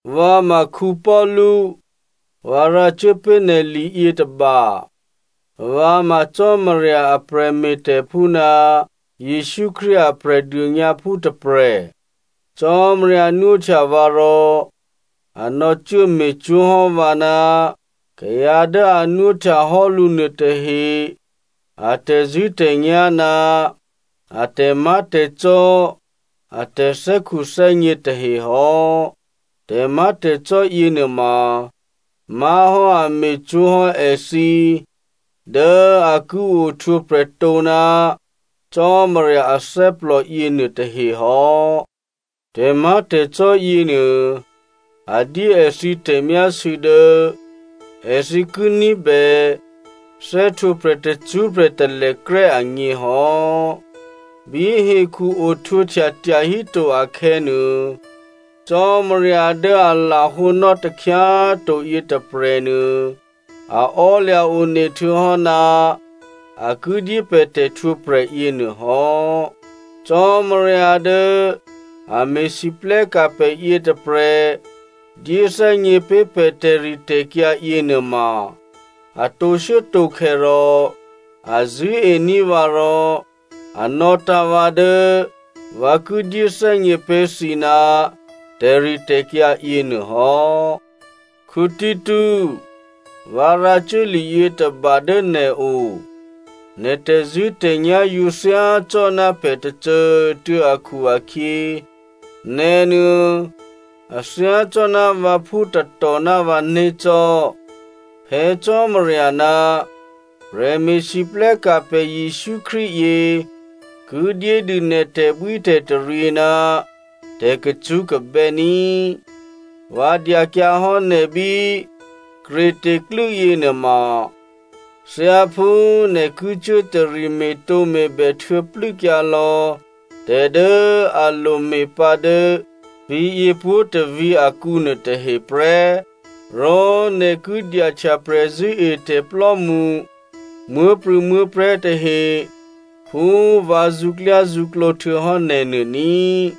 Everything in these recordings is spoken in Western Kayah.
Vǎ ma Paulu, vǎ rǎcuố pé̤ nè̤ li yětôba. Vǎ ma Cò́marya a prè̤me̤tè̤phú ná Jesǔ Krístu a Prè̤dônyǎphú tôprè̤. Cò́marya nwóhtya vǎ rò a nò̌cuố me̤cwó̤hò́ vǎ ná kayǎ dố a nwóhtyahò́ lǔ nuôtahe a tè̤zṳ̂́tè̤nyá̤ ná a tè̤má̤tè̤cò́ a tè̤thè́khuthè́gně tahe hò́. Tè̤má̤tè̤cò́ yěnuôma má̤hò́ a me̤cwó̤hò́ èthǐ dố a ki ohtwǒprè̤ tǒ ná Cò́marya athè́plò yěnuôtahe hò́. Tè̤má̤tè̤cò́ yěnuô a dyé èthǐ tè̤myásû̌ dố èthǐ ki ní̤bè thè́htwǒprè̤ tacṳ́prè̤ talèkrè́ agně hò́. Bí hekhu ohtwǒhtya tyahíto akhè̌nuô, Cò́marya dố a lahǒnò́ takhyá꤮ to yětôprè̤nuô, a ò́lya̤ one htuô̌hò́ ná a ki dyé pè̤ tè̤htwǒprè̤ yěnuô hò́. Cò́marya dố a me̤lwóhteka̤ pè̤ yětôprè̤ dyéthè́gně pé̤ pè̤ tè̤ritè̤kyǎ yěnuôma, a tǒshuốtǒkhè̌ rò a zṳ̂́ení̤ vǎ rò a nò̌tǎ̤ vǎ dố vǎ ki dyéthè́gně pé̤ thǐ ná tè̤ritè̤kyǎ yěnuô hò́. Tito꤮, vǎ rǎcuố li yětôba dố nè̤o. Nè̤ tè̤zṳ̂́tè̤nyá̤ yǒ thyácò́ná pè̤ tôcô꤮ tuô̌ akhu-akhyě, nè̤nuô a thyácò́ná vǎphú tatò ná vǎné̤ cò́. Phè̌ Cò́marya ná prè̤me̤lwóhteka̤ pè̤ Jesǔ Krístu yě ki dyédû nè̤ tè̤bwítè̤taryě ná tè̤kacṳ́kabè́ ní꤮. Vǎ dyakyǎ hò́ nè̤ bí Crete klû́ yěnuôma thyáphú nè̤ ki cuố tari me̤tǒme̤bè htuô̌plû́kyǎ lò̌ tè̤ dố a lome̤pǎ dố vǐ̤yě pwǒ̤tôvǐ̤ akǔ nuôtahe prè́. Rò nè̤ ki dyahtya prè̤zṳ̂́etè̤plò́mṳ muố̤prû̌muố̤prè̤́ tahe phú vǎ zṳ̌klyázṳ̌klǒ htuô̌hò́ nè̤ nuô ní꤮.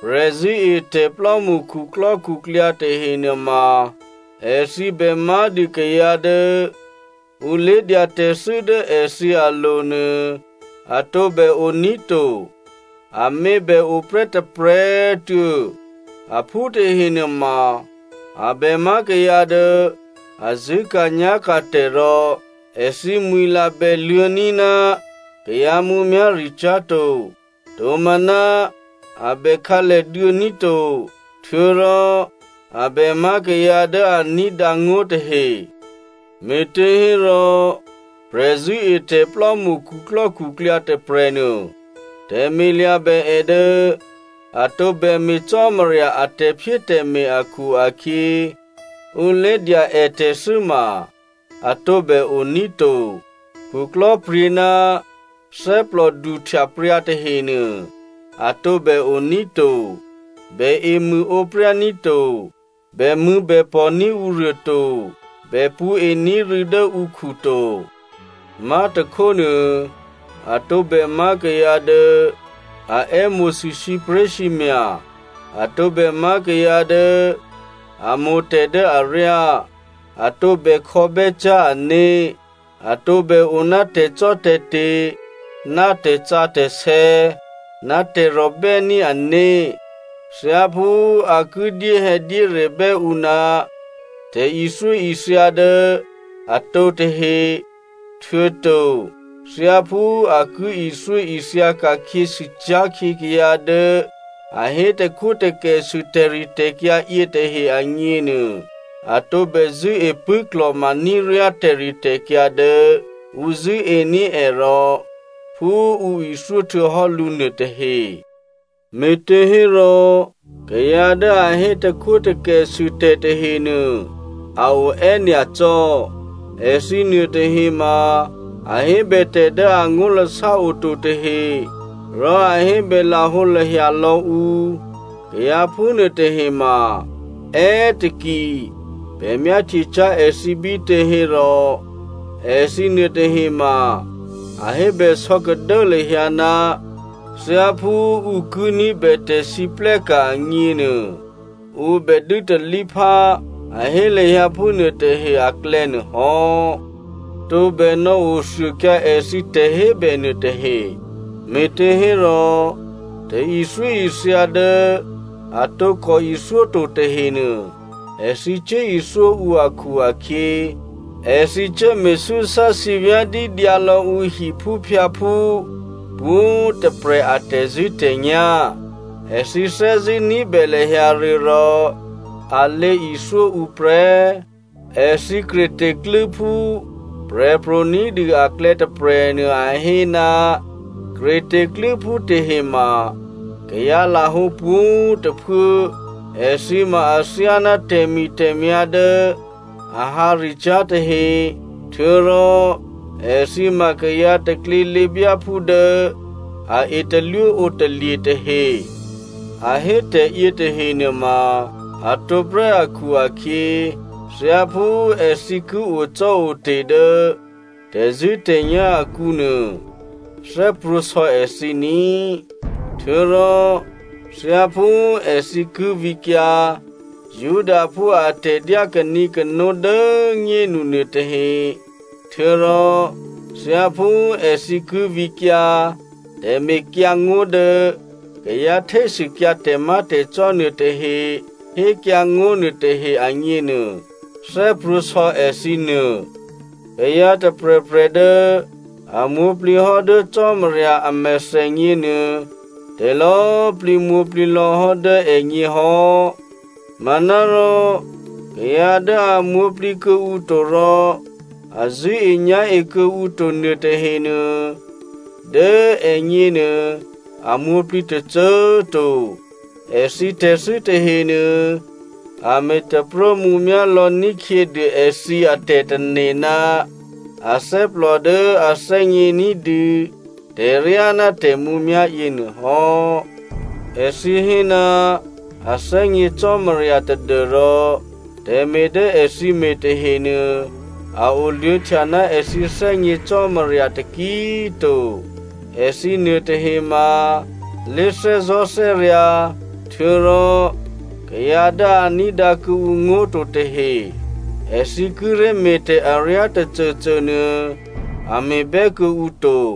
Prè̤zṳ̂́etè̤plò́mṳ khuklò́khuklyǎ tahe nuôma èthǐ bè má̤dû kayǎ dố ǔ lé̤dya tè̤thû́ dố èthǐ alo̤nuô a tǒbè oní̤ to. Amě bè oprè́ tôprè̤꤮ tuô̌, aphú tahe nuôma a bè má̤ kayǎ dố a zṳ̂́ka̤nyá̤ka̤tè̤ rò èthǐ mwi̤la bè luô̌ní̤ ná kayǎ mǔmyá̤ricyá̤ to, tomaná a bè khǎlèduô̌ ní̤ to, htuô̌rò a bè má̤ kayǎ dố a ní̤dǎ ngó̤tahe. Me̤těhérò, prè̤zṳ̂́etè̤plò́mṳ khuklò́khuklyǎ tôprè̤nuô, tè̤me̤ lya̤bè è dố a tǒbè me̤ Cò́marya a tè̤phyétè̤me̤ akhu-akhyě, ǔ lé̤dya è tè̤thû́ ma a tǒbè oní̤ to, khuklò́pryě̤ ná thè́plò duhtyapryǎ tahenuô a tǒbè oní̤ to, bè emṳ̂ǒpryá ní̤ to, bèmṳ̂̌bèpò̤ní̤ ǔruô to, bè pṳ̌ení̤ rû̌ dố ǔkhu to. Má̤tôkhónuô, a tǒbè má̤ kayǎ dố a è́mo̤sû sǐpré̤sǐmya̤, a tǒbè má̤ kayǎ dố a mo̤ tè̤ dố aryá, a tǒbè khò̌bè́cyá̤ ané̤, a tǒbè o ná tè̤cò́tè̤te̤ ná tè̤sǎsè̌ ná tè̤rò̤ bè́ní̤ ané̤, thyáphú a ki dyéhè̌dyérebè́ ǔ ná tè̤ithyóithya dố atǒ tahe, htuô̌to thyáphú a ki ithyóithya ka̤khyěsûcyá̤ khyě kayǎ dố a hé takhwótakèsû tè̤ritè̤kyǎ yětahe agněnuô, a tǒbè zṳ̂́e pṳ̂́klò̤ma ní̤ ryá tè̤ritè̤kyǎ dố ǔ zṳ̂́ení̤ è rò phú ǔ ithyó htuô̌hò́ lǔ nuôtahe. Me̤těhérò kayǎ dố a hé takhwótakèsû tè̤ tahenuô a o è́nyacò́. Èthǐ nuôtahema, a hébè tè̤ dố angó̤lasá oto tahe, rò a hébè lahǒlahya lò̌ ǔ. Kayǎ phúnuô tahema, è́taki, pè̤ myáhtyecyá̤ èthǐ bítě hérò, èthǐ nuôtahema, a hébè sò̌kadố lahyǎ ná thyáphú ǔ ki ní̤bè tè̤lwóhteka̤ agněnuô, ǔ bè dû́talíphá, a hé lahyǎ phúnuô tahe aklè̌ nuôhò́. Tǒbè nò̌othuôkyǎ èthǐ tè̤hébè nuôtahe, me̤těhérò tè̤ithyóithya dố a tǒkò ithyó to tahenuô èthǐ cuốithyó ǔ akhu-akhyě, èthǐ cuố me̤súsá sǐvyá̤dídyǎ lò̌ ǔ hiphúphyǎphú pwǒ̤꤮ tôprè̤ a tè̤zṳ̂́tè̤nyá̤. Èthǐ thè́zṳ̂́ ní̤bè lahyǎ rû̌ rò a lěithyó ǔ prè́. Èthǐ Creta klû́phú prè̤pro̤ ní̤dû aklè̌ tôprè̤nuô a hé, “Creta klû́phú tahema kayǎlahǒ pwǒ̤꤮ tôphuố, èthǐ ma athyáná tè̤mi̤tè̤myá̤ dố a hǎricyá̤ tahe htuô̌rò èthǐ ma kayǎ taklělěbyáphú dố a etalwó ǒtalye̤ tahe.” A hé tè̤ yětahe nuôma a tǒprè́ akhu-akhyě, thyáphú èthǐ ki ocò́ote̤ dố tè̤zṳ̂́tè̤nyá̤ akǔnuô thè́prwǒ̤sò̌ èthǐ ní꤮. Htuô̌rò thyáphú èthǐ ki vǐkyǎ Judaphú atè̤dyá kanǐkano dố꤮ nyénu nuôtahe, htuô̌rò thyáphú èthǐ ki vǐkyǎ tè̤mekyǎngó̤ dố kayǎ htésûkyǎ tè̤má̤tè̤cò́ nuôtahe hékyǎngó̤ nuôtahe agněnuô, thè́prwǒ̤sò̌ èthǐ nuô. Kayǎ tôprè̤prè̤ dố a mwǒ̤plǐ hò́ dố Cò́marya a mèthènyě nuô, tè̤lò̌꤮ plǐ mwǒ̤plǐ lò̌ hò́ dố ègně hò́. Manárò kayǎ dố a mwǒ̤plǐ kuô̌ǔ to rò a zṳ̂́enyá̤e kuô̌ǔ to nuôtahenuô, dố ègněnuô a mwǒ̤plǐ tôcô꤮ to. Èthǐ tè̤thû́ tahenuô a me̤ taprómǔmyá̤ lò̌ ní̤khyědû èthǐ atè̤tane̤ ná athè́plò dố a thè́gně ní̤dû tè̤ryá ná tè̤mǔmyá̤ yěnuôhò́. Èthǐ hé ná a thè́gně Cò́marya tadû́rò tè̤me̤ dố èthǐ me̤ tahenuô a oluô̌htya ná èthǐ thè́gně Cò́marya taki꤮ to. Èthǐ nuôtahema lé̤thè́zò̤́thè́ryǎ̤, htuô̌rò kayǎ dố a ní̤dǎ kuô̌ǔ ngó̤ to tahe, èthǐ kíré̤ me̤tè̤ aryá tôcôcônuô a me̤bè́ kuô̌ǔ to.